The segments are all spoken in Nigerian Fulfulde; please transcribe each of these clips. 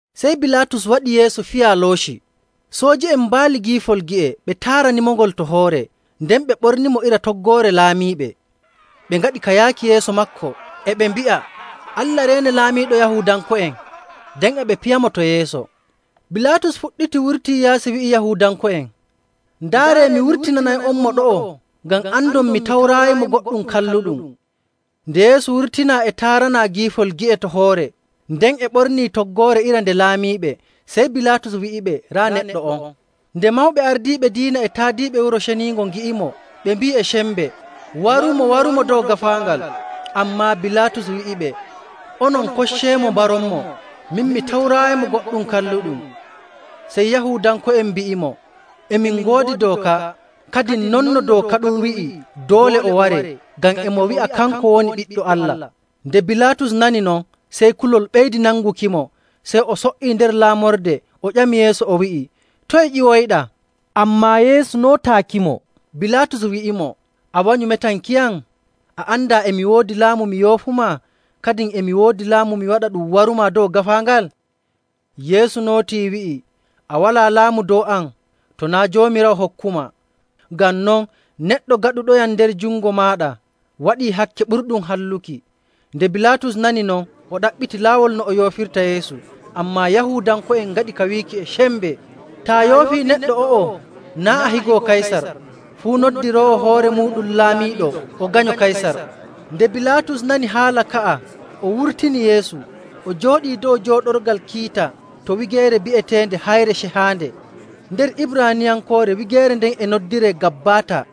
Sey Bilaatus waɗi Yeesu fiyaa looci. Sooji'en mbaali giifol gi'e, ɓe taaranimongol to hoore, nden ɓe ɓornimo iri toggoore laamiiɓe. Ɓe ngaɗi ka yaaki yeeso maako, e ɓe mbi'a, “Allah reene, Laamiiɗo Yahuudanko'en!” Nden e ɓe piyamo to yeeso. Bilaatus fuɗɗiti wurtii yaasi wi'i Yahuudanko'en, “Ndaaree, mi wurtinanay'onmo ɗo'o ngam andon mi tawraayimo goɗɗum kalluɗum.” Nde Yeesu wurtinaa e taaranaa giifol gi'e to hoore nden e ɓornii toggoore iri nde laamiiɓe, sey Bilaatus wi'iɓe, “Raa neɗɗo on.” Nde mawɓe ardiiɓe diina e taadiiɓe Wuro Ceniingo ngi'imo, ɓe mbi'i e sembe, “Warumo! Warumo dow gaafaangal!” Ammaa Bilaatus wi'iɓe, “Onon kocceemo mbaronmo. Min mi tawraayimo goɗɗum kalluɗum.” Sey Yahuudanko'en mbi'imo, “E min ngoodi dooka, kadin non no dooka ɗum wi'i doole o waree, ngam e mo wi'a kanko woni Ɓiɗɗo Allah.” Nde Bilaatus nani non, sey kulol ɓeydi nangukimo. Sey o so''ii nder laamorde o ƴami Yeesu o wi'i, “Toye ƴiwoyɗaa?” Ammaa Yeesu nootaakimo. Bilaatus wi'imo, “A wanyu metankiyam? A andaa e mi woodi laamu mi yoofumaa, kadin e mi woodi laamu mi waɗa ɗum warumaa dow gaafaangal?” Yeesu nootii wi'i, “A walaa laamu dow am to naa' Joomiraawo hokkumaa. Ngam non, neɗɗo gaɗuɗoyam nder jungo maaɗa waɗii hakke ɓurɗum halluki.” Nde Bilaatus nani non, o ɗaɓɓiti laawol no o yoofirta Yeesu, ammaa Yahuudanko'en ngaɗi ka wiiki e sembe, “Taa yoofii neɗɗo o'o, naa' a higo Kaysar! Fuu noddiroowo hoore muuɗum laamiiɗo o ganyo Kaysar!” Nde Bilaatus nani haala ka'a, o wurtini Yeesu, o jooɗii dow jooɗorgal kiita to wigeere bi'eteende “Hayre Cehaande: Njayri ndin kaaƴe cehaaɗe ndi waɗira..” Nder Ibraaniyankoore wigeere nden e noddiree Gabbaata.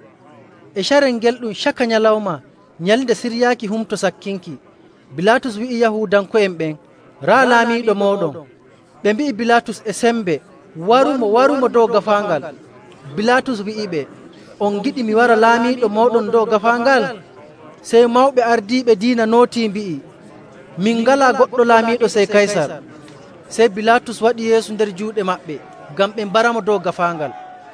E carel ngel ɗum caka nyalawma nyalnde siryaaki Humto Sakkinki. Bilaatus wi'i Yahuudanko'en ɓen, “Raa laamiiɗo mooɗon.” Ɓe mbi'i Bilaatus e sembe, “Warumo! Warumo dow gaafaangal!” Bilaatus wi'iɓe, “On ngiɗi mi wara laamiiɗo mooɗon dow gaafaangal?” Sey mawɓe ardiiɓe diina nootii mbi'i, “Min ngalaa goɗɗo laamiiɗo sey Kaysar!” Sey Bilaatus waɗi Yeesu nder juuɗe maɓɓe ngam ɓe mbaramo dow gaafaangal.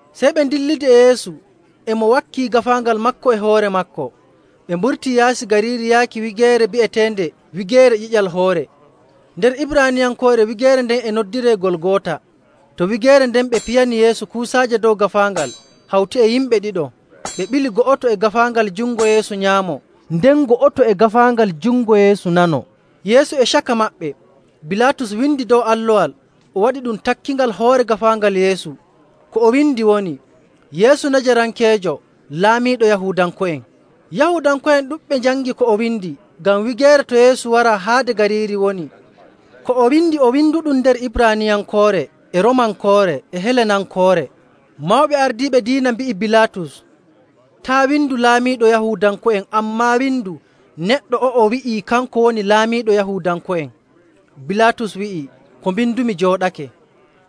Sey ɓe ndillidi e Yeesu, e mo wakkii gaafaangal maako e hoore maako. Ɓe mburtii yaasi gariiri yaaki wigeere bi'eteende Wigeere Ƴiƴal Hoore. Nder Ibraaniyankoore wigeere nden e noddiree Golgoota. To wigeere nden ɓe piyani Yeesu kuusaaje dow gaafaangal hawti e yimɓe ɗiɗo. Ɓe ɓili go'oto e gaafaangal jungo Yeesu nyaamo, nden go'oto e gaafaangal jungo Yeesu nano, Yeesu e caka maɓɓe. Bilaatus windi dow allowal o waɗi ɗum takkingal hoore gaafaangal Yeesu. Ko o windi woni, “Yeesu Najarankeejo Laamiiɗo Yahuudanko'en.” Yahuudanko'en ɗuɗɓe njangi ko o windi, ngam wigeere to Yeesu waraa haade gariiri woni. Ko o windi o winduɗum nder Ibraaniyankoore, e Roomankoore, e Helenankoore. Mawɓe ardiiɓe diina mbi'i Bilaatus, “Taa' windu ‘Laamiiɗo Yahuudanko'en,’ ammaa windu neɗɗo o'o wi'ii kanko woni laamiiɗo Yahuudanko'en.” Bilaatus wi'i, “Ko mbindumi jooɗake.”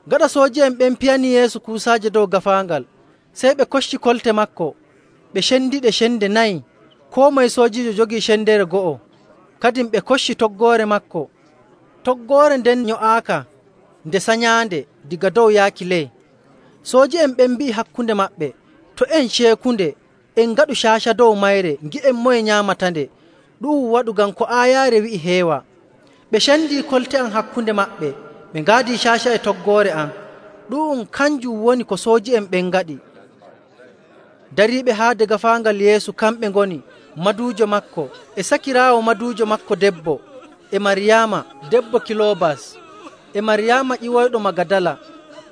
Gaɗa sooji'en ɓen piyanii Yeesu kuusaaje dow gaafaangal, sey ɓe kocci kolte maako, ɓe cendiɗe cende nayi, koo moye soojiijo jogii sendere go'o. Kadin ɓe kocci toggoore maako. Toggoore nden nyo'aaka nde sanyaande daga dow yaaki ley. Sooji'en ɓen mbi'i hakkunde maɓɓe, “To' en ceekunde, en ngaɗu caaca dow mayre ngi'en moye nyaamatande.” Ɗu'um waɗu ngam ko aayaare wi'i heewa:. “Ɓe cendii kolte am hakkunde maɓɓe; ɓe ngaadii caaca e toggoore am.” Ɗu'um kanjum woni ko sooji'en ɓen ngaɗi. Dariiɓe haade gaafaangal Yeesu kamɓe ngoni maduujo maako, e sakiraawo maduujo maako debbo, e Maryaama debbo Kiloobas, e Maryaama ƴiwoyɗo Magadala.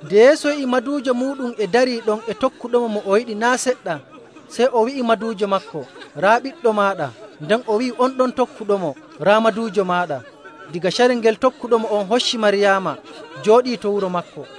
Nde Yeesu yi'i maduujo muuɗum e darii ɗon e tokkuɗomo mo o yiɗi naa' seɗɗa. Sey o wi'i maduujo maako, “Raa ɓiɗɗo maaɗa.” Nden o wi'i on ɗon tokkuɗomo, “Raa maduujo maaɗa.” Daga carel ngel tokkuɗomo on hocci Maryaama jooɗii to wuro maako.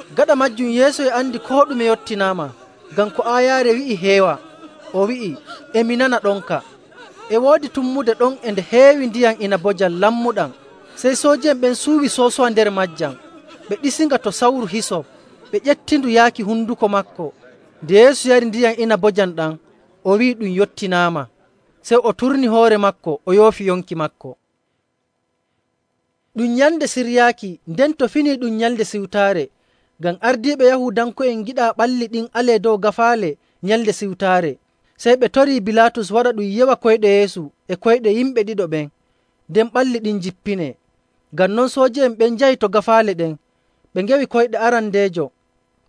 Gaɗa maajum, Yeesu e andi koo ɗume yottinaama. Ngam ko aayaare wi'i heewa, o wi'i, “E mi nana ɗonka.”. E woodi tummude ɗon e nde heewi ndiyam inabojam lammuɗam. Sey sooji'en ɓen cuuwi soosowa nder maajam, ɓe ɗiisinga to sawru hisop, ɓe ƴeftindu yaaki honduko maako. Nde Yeesu yari ndiyam inabojam ɗam, o wi'i, “Ɗum yottinaama.” Sey o turni hoore maako o yoofi yonki maako. Ɗum Nyalnde Siryaaki, nden to fini ɗum Nyalnde Siwtaare. Ngam ardiiɓe Yahuudanko'en ngiɗaa ɓalli ɗin alee dow gaafaale Nyalnde Siwtaare, sey ɓe torii Bilaatus waɗa ɗum yewa koyɗe Yeesu e koyɗe yimɓe ɗiɗo ɓen, nden ɓalli ɗin njippinee. Ngam non sooji'en ɓen njahi to gaafaale ɗen. Ɓe ngewi koyɗe arandeejo,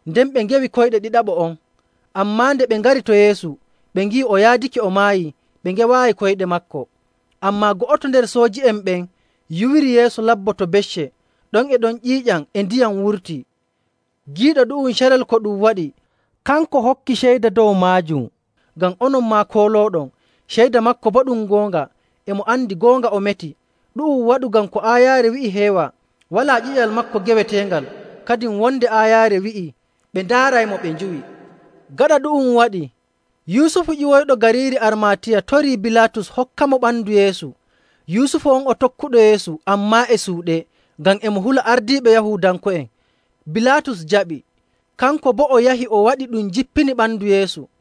nden ɓe ngewi koyɗe ɗiɗaɓo on. Ammaa nde ɓe ngari to Yeesu ɓe ngi'i o yaadake o maayii, ɓe ngewaayi koyɗe maako. Ammaa go'oto nder sooji'en ɓen yuwiri Yeesu labbo to becce, ɗon e ɗon ƴiiƴam e ndiyam wurtii. Giiɗo ɗu'um carel ko ɗum waɗi, kanko hokkii ceyda dow maajum, ngam onon maa koolooɗon. Ceyda maako boo ɗum goonga, e mo andi goonga o meti. Ɗu'um waɗu ngam ko aayaare wi'i heewa, “Walaa ƴiƴal maako geweteengal.”. Kadin wonde aayaare wi'ii, “Ɓe ndaaray mo ɓe njuwi.”. Gaɗa ɗu'um waɗii, Yusufu ƴiwoyɗo gariiri Armaatiya torii Bilaatus hokkamo ɓandu Yeesu. Yusufu on o tokkuɗo Yeesu, ammaa e suuɗe ngam e mo hula ardiiɓe Yahuudanko'en. Bilaatus jaɓi, kanko boo o yahi o waɗi ɗum jippini ɓandu Yeesu.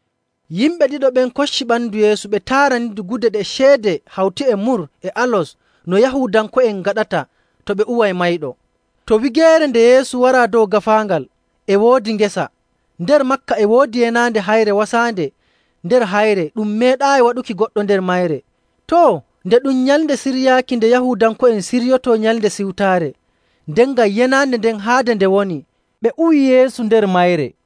Yimɓe ɗiɗo ɓen kocci ɓandu Yeesu ɓe taaranindu gude ɗe ceede hawti e mur e alos no Yahuudanko'en ngaɗata to ɓe uway mayɗo. To wigeere nde Yeesu waraa dow gaafaangal, e woodi ngesa. Nder maaka e woodi yenaande heyre wasaande nder hayre ɗum meeɗaayi waɗuki goɗɗo nder mayre. Too, nde ɗum Nyalnde Siryaaki nde Yahuudanko'en ciryotoo Nyalnde Siwtaare, nden ngam yenaande nden haade nde woni, ɓe uwi Yeesu nder mayre.